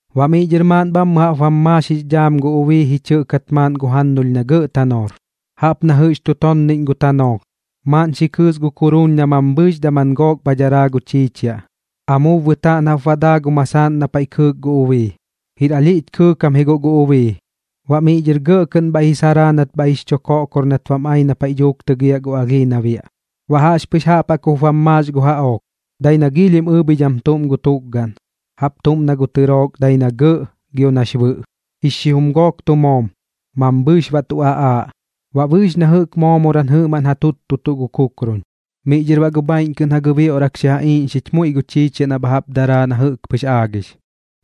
Baꞌ miꞌ dhɨr maaꞌn bhammɨ jaꞌp bam maax jix dhaam gu ubii ji chɨꞌkat maaꞌn gu jannulh na gɇꞌ tanoor, jaꞌp na jɨꞌx tu tonniꞌñ gu tanoolh, maaꞌn xi kɨɨs gu kuruun na mambhɨɨx daman gook bha daraa gu chiichiaꞌ, amuub bɨtaaꞌn jaꞌp baꞌ daa gu masaaꞌn na paiꞌ kɨɨk gu ubii. Jir alhiꞌch kɨɨkam ji guꞌ gu ubii, baꞌ miꞌ dhɨr gɇꞌ kɨꞌn bhaiꞌ ji saraa nat bhaiꞌ jix chu koꞌkor nat bam ai na paiꞌ dhuuk tɨgiaꞌ gu alhii na biaꞌ. Baꞌ jaꞌxpɨx jaꞌp jaꞌk jup bam maax gu jaꞌook, dai na giilhim ɨɨbhidham tuꞌm gu tukgaꞌn, jaꞌp tuꞌm na tɨrook dai na gɇꞌ gio nax bɨꞌ, xijum gook tu moom, mambhɨɨx baꞌ tu aꞌaaꞌ, baꞌ bɨɨx na jɨꞌk moomoram jɨꞌmaꞌn ja tuttutuꞌ gu kukrun. Miꞌ dhɨr baꞌ gu bhaiꞌñ kɨꞌn ja gɨbioꞌrak xi ja iiꞌñxich muiꞌ gu chiichiaꞌ na bha jaꞌp daraa na jɨꞌk pɨx aagix,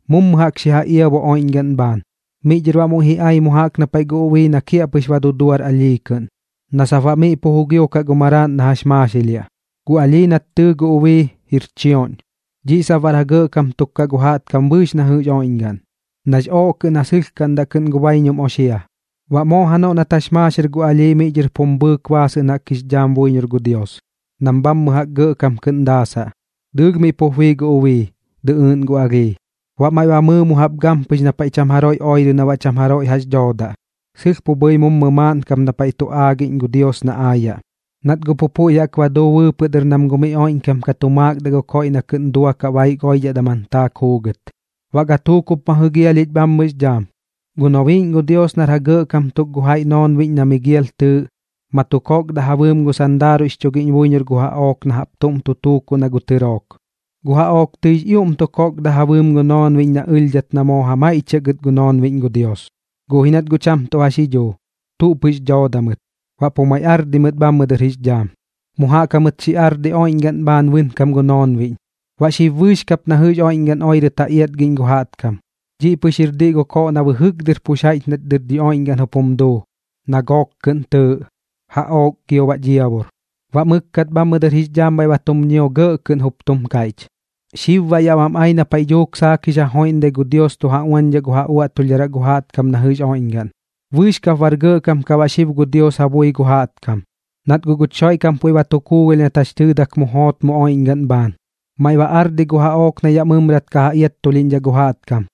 mummu jaꞌk xi ja iabu oiꞌñgaꞌn bhaan. Miꞌ dhɨr baꞌ muiꞌ ji ai mu jaꞌk na paiꞌ gu ubii na kiaꞌpɨx ba duduar alhii kɨꞌn, na sap baꞌ miꞌ pu jugiokaꞌ gu maraaꞌn na jax maaxilhiaꞌ. Gu alhii nat tɨɨ gu ubii, jir chioꞌñ. Dhiꞌ sap baꞌr ja gɇꞌkam tuk kaꞌ gu jaꞌtkam bɨɨx na jɨꞌx oiꞌñgaꞌn, nax ooꞌ kɨꞌn ja sɨlhkaꞌndaꞌ kɨꞌn gu baiñum oxia. Baꞌ moo janoꞌ nat jax maaxir gu alhii miꞌ dhɨr pum bhɨɨk baasɨꞌn jaꞌk jix dhaam buiñor gu Dios, nam bhammɨ jaꞌk gɇꞌkam kɨꞌn daasaꞌ. Dɨɨlh miꞌ pup bii gu ubii, dɨꞌɨɨꞌn gu alhii. Baꞌ maiꞌ ba mɨɨ mu jaꞌp gampɨx na paiꞌ cham jaroiꞌ oirɨ na baꞌ cham jaroiꞌ jax dhoodaꞌ, sɨlh pu bhɨi mummu maaꞌn kap na paiꞌ tu aagiꞌñ gu Dios na aayaꞌ, nat guꞌ pu puiꞌ jaꞌk ba duu bɨɨpɨꞌ dɨr nam gu miꞌ oiꞌñkam ka tu maakdaꞌ gu koiꞌ na kɨꞌn duakaꞌ baik oiꞌdhaꞌ daman taak juugɨt. Baꞌ gatuuk jup ma jɨgialhich bhammɨx dhaam, gu nobiiꞌñ gu Dios nar ja gɇꞌkam tuk gu jaiꞌ noonbiꞌñ na Migial tɨɨꞌ, ma tu kokda ja bɨɨm gu sandaaruiꞌx chugiꞌñ buiñor gu jaꞌook na jaꞌp tuꞌm tu tuukuꞌ na gu tɨrook. Gu jaꞌook tɨix ioꞌm tu kokda ja bɨɨm gu noonbiꞌñ na ɨlhdhat na moo ja maiꞌchiaꞌ gɨt gu noonbiꞌñ gu Dios. Guꞌ ji nat guꞌ cham tuꞌ jax ji dhuu, tuꞌ pɨx dooda mɨt, baꞌ pu maiꞌ ardi mɨt bhammɨ dɨr jix dhaam. Mu jaꞌk jamɨt xi ardi oiꞌñgaꞌn bhaan bɨnkam gu noonbiꞌñ, baꞌ xib bɨɨx kap na jɨꞌx oiꞌñgaꞌn oirɨt ja iatgiꞌñ gu jaꞌtkam. Dhiꞌ pɨx jir diꞌ gu koꞌ na bɨjɨk dɨr pu jaiꞌch nat dɨr dhi oiꞌñgaꞌn jup jum duu, na gook kɨꞌn tɨɨꞌ: Jaꞌook gio baꞌ Dhiabur. Baꞌ mɨkkat bhammɨ dɨr jix dhaam bhaiꞌ ba tum ñio gɇꞌ kɨꞌn, jup tum kaiꞌch: ―Xib baꞌ yaꞌ bam ai na paiꞌ dhuuk saak jix ja joiꞌndai gu Dios tu ja uañdhaꞌ gu ja uaꞌtulhdharaꞌ gu jaꞌtkam na jɨꞌx oiꞌñgaꞌn. Bɨɨx kap bar gɇꞌkam baꞌ xib gu Dios ja bui gu jaꞌtkam, nat guꞌ guch Xoiꞌkam puiꞌ ba tu kuugalh nat jax tɨɨdak mu joot mu oiꞌñgaꞌn bhaan, maiꞌ ba ardi guꞌ gu jaꞌook na yaꞌ mɨmrat ka ja iattulhiꞌñdhaꞌ gu jaꞌtkam,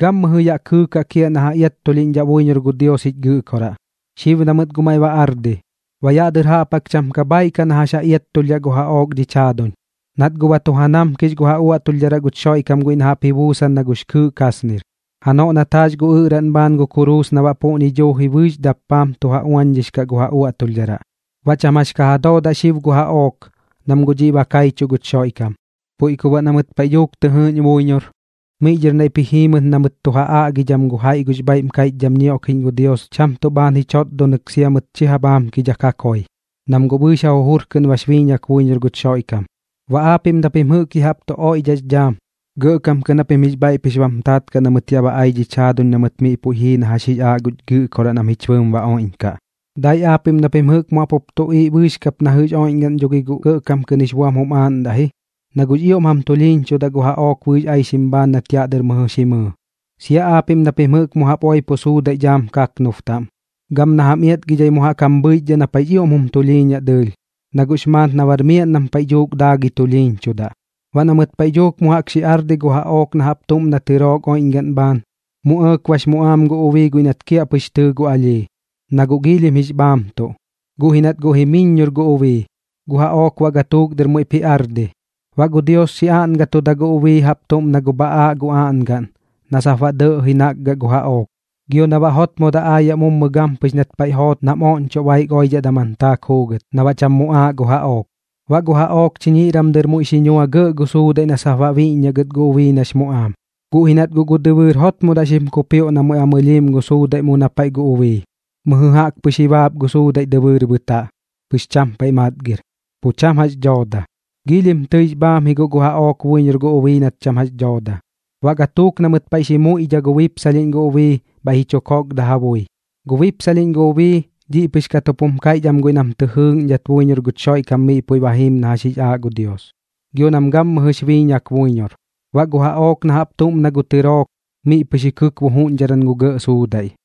gammɨjɨ yaꞌ kɨɨkaꞌ kiaꞌ na ja iattulhiꞌñchuꞌndaꞌ buiñor gu Dios jich Gɨꞌkoraꞌ. Xib na mɨt guꞌ maiꞌ ba ardi, baꞌ yaꞌ dɨr jaꞌp jaꞌk cham ka bhaaiꞌ kaꞌ na jax ja iattulhdhaꞌ gu jaꞌook dhich jaaduñ, nat guꞌ ba tu ja namkix gu ja uaꞌtulhdharaꞌ guch Xoiꞌkam guiꞌ na jaꞌp ji buusan na gux kɨɨꞌ kasnir, janoꞌ nat jaax gu ɨꞌraꞌn bhaan gu kuruus na baꞌ puꞌñi duuji bɨɨx dappaam tu ja uañdhix kaꞌ gu ja uaꞌtulhdharaꞌ. Baꞌ cham jax ka ja doodaꞌ xib gu jaꞌook, nam guꞌ dhiꞌ ba kaichuꞌ guch Xoiꞌkam. Puiꞌ ku baꞌ na mɨt paiꞌ dhuuk tɨ jɨɨꞌñ buiñor, miꞌ dhɨr naiꞌp ji jii mɨt na mɨt tu ja aꞌgidham gu jaiꞌ gux bhaiꞌm kaiꞌchdham ñioꞌkiꞌñ gu Dios cham tuꞌ bhaan ji chotdonɨk sia mɨt chi ja bhaamkidhak ja koi, nam guꞌ bɨɨx ja jujur kɨꞌn bax biiñak buiñor guch Xoiꞌkam. Baꞌ aapiꞌm na pim jɨꞌk ya jaꞌp tu oiꞌdhaꞌx dhaam, gɇꞌkam kɨꞌn japim jix bhaiꞌ pɨx bam taat kaꞌ na mɨt yaꞌ ba ai dhich jaaduñ na mɨt miꞌ puiꞌ jii na jax jix aaꞌ guch Gɨꞌkoraꞌ nam jich bɨɨm ba oiꞌñkaꞌ. Dai aapiꞌm na pim jɨꞌk mu jaꞌp jup tuꞌiiꞌ bɨɨx kap na jɨꞌx oiꞌñgaꞌn dho gi guꞌ gɇꞌkam kɨꞌn jix buam jum aaꞌndaꞌ ji, na guꞌx ioꞌm jam tulhiiñchudaꞌ gu jaꞌook bɨɨx aixim bhaan nat yaꞌ dɨr mɨjɨ xi mɨɨ, sia aapiꞌm na pim jɨꞌk mu jaꞌp oipo suudaiꞌ dhaam kaknub taꞌm, gam na jam iatgidhai mu jaꞌk jam bhɨichdhaꞌ na paiꞌx ioꞌm jum tulhiiñaꞌ dɨɨlh, na guꞌx maat na bar miaꞌn nam paiꞌ dhuuk daagɨi tulhiiñchudaꞌ. Baꞌ na mɨt paiꞌ dhuuk mu jaꞌk xi ardi gu jaꞌook na jaꞌp tuꞌm na tɨrook oiꞌñgaꞌn bhaan, mu ɇɇk bax muꞌaam gu ubii guiꞌ nat kiaꞌpɨx tɨɨ gu alhii, na guꞌ giilhim jix bhaamtuꞌ. Guꞌ ji nat guꞌ jimiññor gu ubii, gu jaꞌook baꞌ gatuuk dɨr muiꞌp ji ardi. Baꞌ gu Dios xi aꞌngatudaꞌ gu ubii jaꞌp tuꞌm na gu bhaꞌaaꞌ gu aꞌngaꞌn na sap baꞌ dɇꞌji nakgaꞌ gu jaꞌook, gio na baꞌ jotmodaꞌ aayaꞌ mummu gampɨx nat paiꞌ joot nam oꞌñchoꞌ baik oidhaꞌ daman taak juugɨt, na baꞌ cham muꞌaaꞌ gu jaꞌook. Baꞌ gu jaꞌook chiñiꞌram dɨr muiꞌ xi nua gɇꞌ gu suudaiꞌ na sap baꞌ biꞌññaꞌ gɨt gu ubii nax muꞌaam, guꞌ ji nat guꞌ gu dɨbɨɨr jotmodaꞌ xim kupioꞌ na muiꞌ ba mɨlhiim gu suudaiꞌ mu na paiꞌ gu ubii, mɨjɨ jaꞌk pɨx ji baap gu suudaiꞌ dɨbɨɨr bɨtaꞌ, pɨx cham paiꞌ matgir, pu cham jax dhooda. Giilhim tɨix bhaam ji guꞌ gu jaꞌook buiñor gu ubii nat cham jax dhooda. Baꞌ gatuuk na mɨt paiꞌ xi muiꞌdha gu bipsalhiꞌñ gu ubii, bhaiꞌ ji chu kokda ja bui. Gu bipsalhiꞌñ gu ubii, dhiꞌ pɨx kat jup jum kaiꞌch am guiꞌ nam jɨꞌk tɨ jɨɨꞌñdhat buiñor guch Xoiꞌkam miꞌ puiꞌ ba jiim na jax jix aaꞌ gu Dios, gio nam gammɨjɨx biiñak buiñor. Baꞌ gu jaꞌook na jaꞌp tuꞌm na gu tɨrook, miꞌ pɨx ji kɨkbu juꞌñdharam gu gɇꞌ suudaiꞌ.